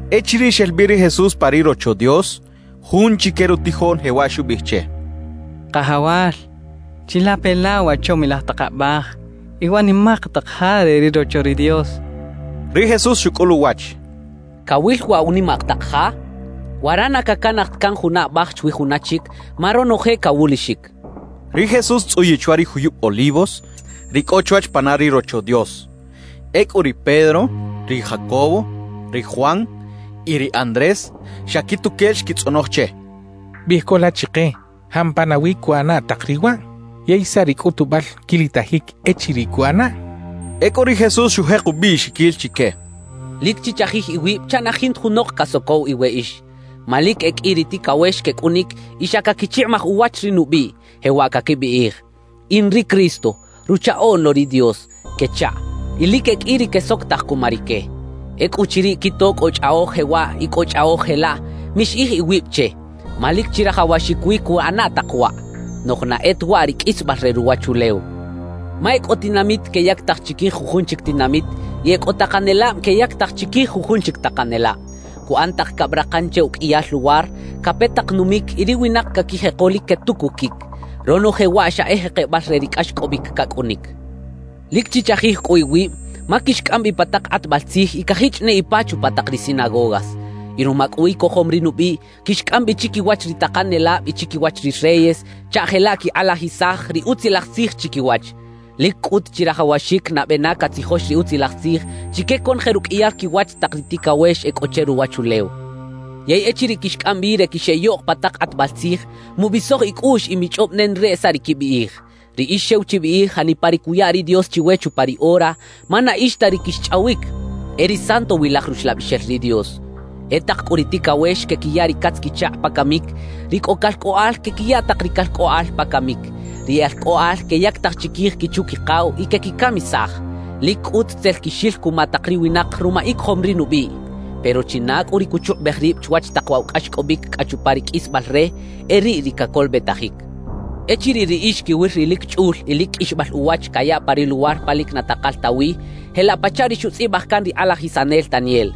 Echiriꞌ xel bi ri Jesús pa ri Rocho Dios, jun chique rutijoꞌn jewaꞌ xubiꞌij che: —Kajawal, ¡chilape la wa chomilaj tak abaj y wa nimak tak ja re ri Rocho Dios! —xchaꞌ. Ri Jesús xucꞌul uwach: —¿Cawil waꞌ wa nimak tak ja? Wara na cacanaj ta can juna abaj chwi juna chic, ma ronoje cawulixic —xchaꞌ. Ri Jesús xtzꞌuyiꞌ chwa ri juyub Olivos, ri cꞌo chwach pana ri Rocho Dios. Ecꞌu ri Pedro, ri Jacobo, ri Juan y ri Andrés, xa quituquel xquitzꞌonoj che: —Biꞌij co la chike, ¿jampa nawi cuꞌana tak riꞌ waꞌ? ¿Yey saꞌ ri cꞌutubal quilitajic echiriꞌ cuꞌanaꞌ? —xechaꞌ. Ecꞌu ri Jesús xujek ubiꞌxiquil chique: «Lic chichajij iwib chaꞌ na jinta junok casocow iweꞌix. Ma lic e qꞌui ri ticawex quecꞌunic y xa caquichikꞌimaj uwach ri nubiꞌ, jewaꞌ caquibiꞌij: “In ri Cristo, Ruchaꞌoꞌn lo ri Dios” quechaꞌ. Y lic e qꞌui ri quesocotaj cuma rique. »Ecꞌuchiriꞌ quito cꞌo chꞌaꞌoj jewaꞌ y cꞌo chꞌaꞌoj jelaꞌ, mixiꞌij iwib che; ma lic chirajawaxic wi cuꞌana tak waꞌ. Noꞌj na e ta waꞌ ri qꞌuisbal re ruwachulew. Ma e cꞌo tinamit queyactaj chiquij jujun chic tinamit y e cꞌo takanelab queyactaj chiquij jujun chic takanelab. Cuꞌan tak cabrakan che uqꞌuiyal luwar, cape tak numic y ri winak caquijeko lic quetucuquic. Ronoje waꞌ xa e jekebal re ri cꞌaxcꞌobic cacꞌunic. »Lic chichajij cꞌu iwib, ma quixcꞌam bi pa tak kꞌatbal tzij y cajichꞌ ne ipa chupa tak ri sinagogas. Y ruma cꞌu icojom ri nubiꞌ, quixcꞌam bi chiquiwach ri takanelab y chiquiwach ri reyes, chaꞌ jelaꞌ quikꞌalajisaj ri Utzilaj Tzij chiquiwach. Lic cꞌut chirajawaxic nabe na catzijox ri Utzilaj Tzij chique conoje ruqꞌuiyal quiwach tak ri ticawex e cꞌo che ruwachulew. Yey echiriꞌ quixcꞌam bi re quixeꞌyoꞌk pa tak kꞌatbal tzij, mubisoj icꞌuꞌx y michꞌob nenareꞌ saꞌ ri quibiꞌij. Riꞌix xew chibiꞌij janipa ri cuya ri Dios chiwe chupa ri ora, ma na ix ta ri quixchꞌawic, e ri Santowilaj Ruxlabixel ri Dios. »E tak cꞌu ri ticawex quequiya ri catz-quichakꞌ pa camic; ri cꞌo calcꞌoꞌal quequiya tak ri calcꞌoꞌal pa camic; ri e alcꞌoꞌal queyactaj chiquij quichu-quikaw y quequicamisaj. Lic cꞌut tzel quixil cuma tak ri winak ruma icojom ri nubiꞌ. Pero china cꞌu ri cuchukꞌubej rib chwach tak waꞌ wa cꞌaxcꞌobic cꞌa chupa ri qꞌuisbal re, e riꞌ ri cacolobetajic. »Echiriꞌ riꞌix quiwil ri lic chꞌul y lic qꞌuixbal uwach cayaꞌ pa ri luwar pa lic na takal ta wi, jelaꞌ pachaꞌ ri xutzꞌibaj can ri kꞌalajisanel Daniel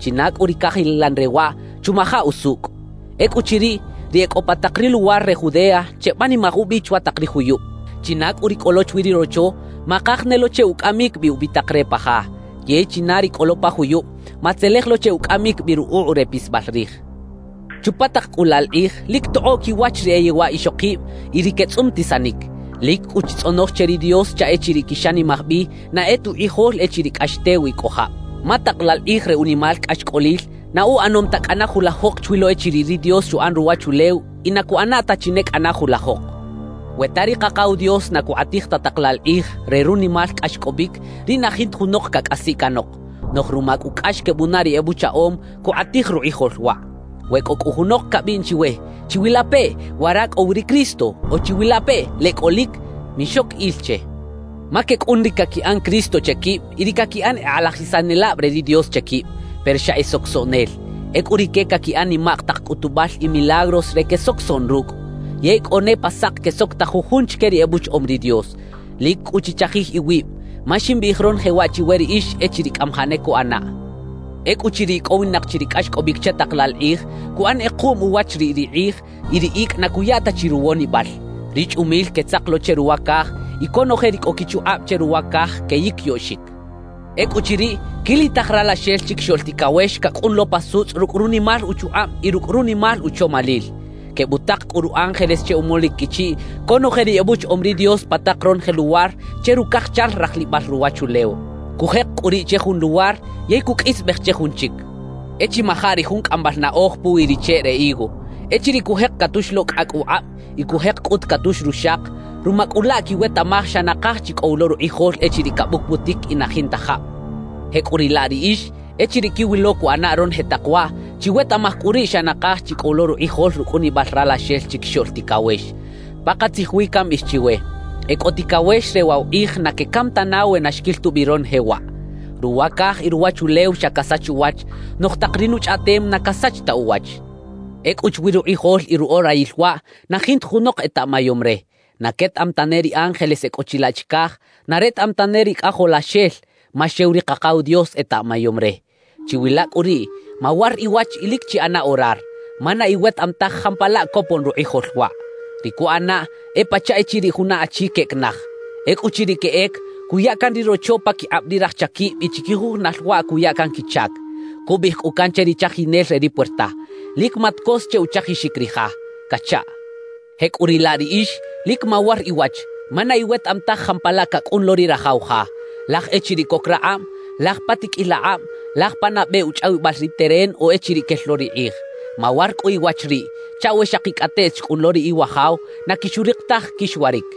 (china cꞌu ri cajilan re waꞌ, chumaja usucꞌ); ecꞌuchiriꞌ, ri e cꞌo pa tak ri luwar re Judea, chebanimaj ubi chwa tak ri juyub. China cꞌu ri cꞌo lo chwi ri rocho, makaj ne lo che ucꞌamic bi ubitak re pa ja. Yey china ri cꞌo lo pa juyub, matzelej lo che ucꞌamic bi rukꞌuꞌ re pisbal rij. »Chupa tak cꞌu laꞌ la kꞌij, lic tokꞌoꞌ quiwach ri e yewaꞌ ixokib y ri quetzꞌumtisanic. Lic cꞌu chitzꞌonoj che ri Dios chaꞌ echiriꞌ quixanimaj bi na e ta ukꞌijol echiriꞌ cꞌax tew y cꞌo jab. Ma tak laꞌ la kꞌij re unimal cꞌaxcꞌolil, na uꞌanom ta cꞌana julajok chwi lo echiriꞌ ri Dios xuꞌan ruwachulew y na cuꞌana ta chi ne cꞌana julajok. We ta ri Kakaw Dios na cukꞌatij ta tak laꞌ la kꞌij re runimal cꞌaxcꞌobic, riꞌ na jinta junok cacꞌasiꞌ canok; noꞌj ruma cꞌu cꞌax quebunaꞌ ri ebuchaꞌom, cukꞌatij rukꞌijol waꞌ. »We cꞌo cꞌu junok cabiꞌn chiwe: “¡Chiwilapeꞌ, wara cꞌo wi ri Cristo!” o “¡Chiwilapeꞌ, leꞌ cꞌolic!”, mixoc il che. Ma quecꞌun ri caquiꞌan “Cristo” che quib y ri caquiꞌan e kꞌalajisanelab re ri Dios che quib, pero xa e socosoꞌnel. Ecꞌu rique caquiꞌan nimak tak cꞌutubal y milagros re quesocosoꞌn rucꞌ, yey cꞌo ne pa sak quesocotaj jujun chique ri ebuchaꞌom ri Dios. Lic cꞌu chichajij iwib, ma ximbiꞌij ronoje waꞌ chiwe riꞌix echiriꞌ cꞌamajaꞌ ne cuꞌanaꞌ. »Ecꞌuchiriꞌ icꞌowinak chi ri cꞌaxcꞌobic che tak laꞌ laꞌ kꞌij, cuꞌan kꞌekuꞌm uwach riꞌ ri kꞌij, y ri icꞌ na cuya ta chi ruwonibal. Ri chꞌumil quetzak lo che ruwa caj, y conoje ri cꞌo quichukꞌab che ruwa caj queyiquiyoꞌxic. Ecꞌuchiriꞌ, quilitaj Ralaxel Chiquixoꞌl Ticawex cacꞌun lo pa sutzꞌ rucꞌ runimal uchukꞌab y rucꞌ runimal uchomalil. Quebutak cꞌu ru ángeles che umolic quichiꞌ conoje ri ebuchaꞌom ri Dios pa tak ronoje luwar che rucajchal rajlibal ruwachulew. Cujek cꞌu riꞌ che jun luwar, yey cuqꞌuisbej che jun chic. »E chimaja ri jun cꞌambal naꞌoj puwi ri cheꞌ re higo: Echiriꞌ cujek catux lo cꞌacꞌ ukꞌab y cujek cꞌut catux ruxak, ruma cꞌu laꞌ quiwetaꞌmaj xa nakaj chi cꞌo wi lo rukꞌijol echiriꞌ cabucbutic y na jinta jab. Jecꞌuriꞌlaꞌ riꞌix, echiriꞌ quiwilo cuꞌana ronoje tak waꞌ, chiwetaꞌmaj cꞌu riꞌ xa nakaj chi cꞌo wi lo rukꞌijol rucꞌunibal Ralaxel Chiquixoꞌl Ticawex. Pakatzij wi cambiꞌij chiwe: E cꞌo ticawex re waꞌ wa kꞌij na quecam tana we na xquil tubi ronoje waꞌ. Ruwa caj y ruwachulew xa casach uwach, noꞌj tak ri nuchꞌaꞌtem na casach ta uwach. »Ecꞌu chwi rukꞌijol y ruꞌorayil waꞌ, na jinta junok etaꞌmayom re; na quetaꞌam tane ri ángeles e cꞌo chilaꞌ chicaj, na retaꞌam tane ri Cꞌajolaxel, ma xew ri Kakaw Dios etaꞌmayom re. »Chiwila cꞌu riꞌ, mawar iwach y lic chiꞌana orar, ma na iwetaꞌam taj jampalaꞌ copon rukꞌijol waꞌ. Ri cuꞌanaꞌ e pachaꞌ echiriꞌ juna achi queꞌec naj. Ecꞌuchiriꞌ queꞌec, cuya can ri rocho paquikꞌab ri raj chaquib y chiquijujunal waꞌ cuya can quichac. Cubiꞌij cꞌu can che ri chajinel re ri puerta: “Lic matcos che uchajixic ri ja” cachaꞌ. Jecꞌuriꞌlaꞌ riꞌix, lic mawar iwach, ma na iwetaꞌam taj jampalaꞌ cacꞌun lo ri rajaw ja; laj echiriꞌ coc rakꞌab, laj pa tiqꞌuil akꞌab, laj pa nabe uchꞌawibal ri teren o echiriꞌ quel lo ri kꞌij. Mawar cꞌu iwach riꞌ, chaꞌ we xakicꞌateꞌt xcꞌun lo ri Iwajaw, na quixurik taj quixwaric.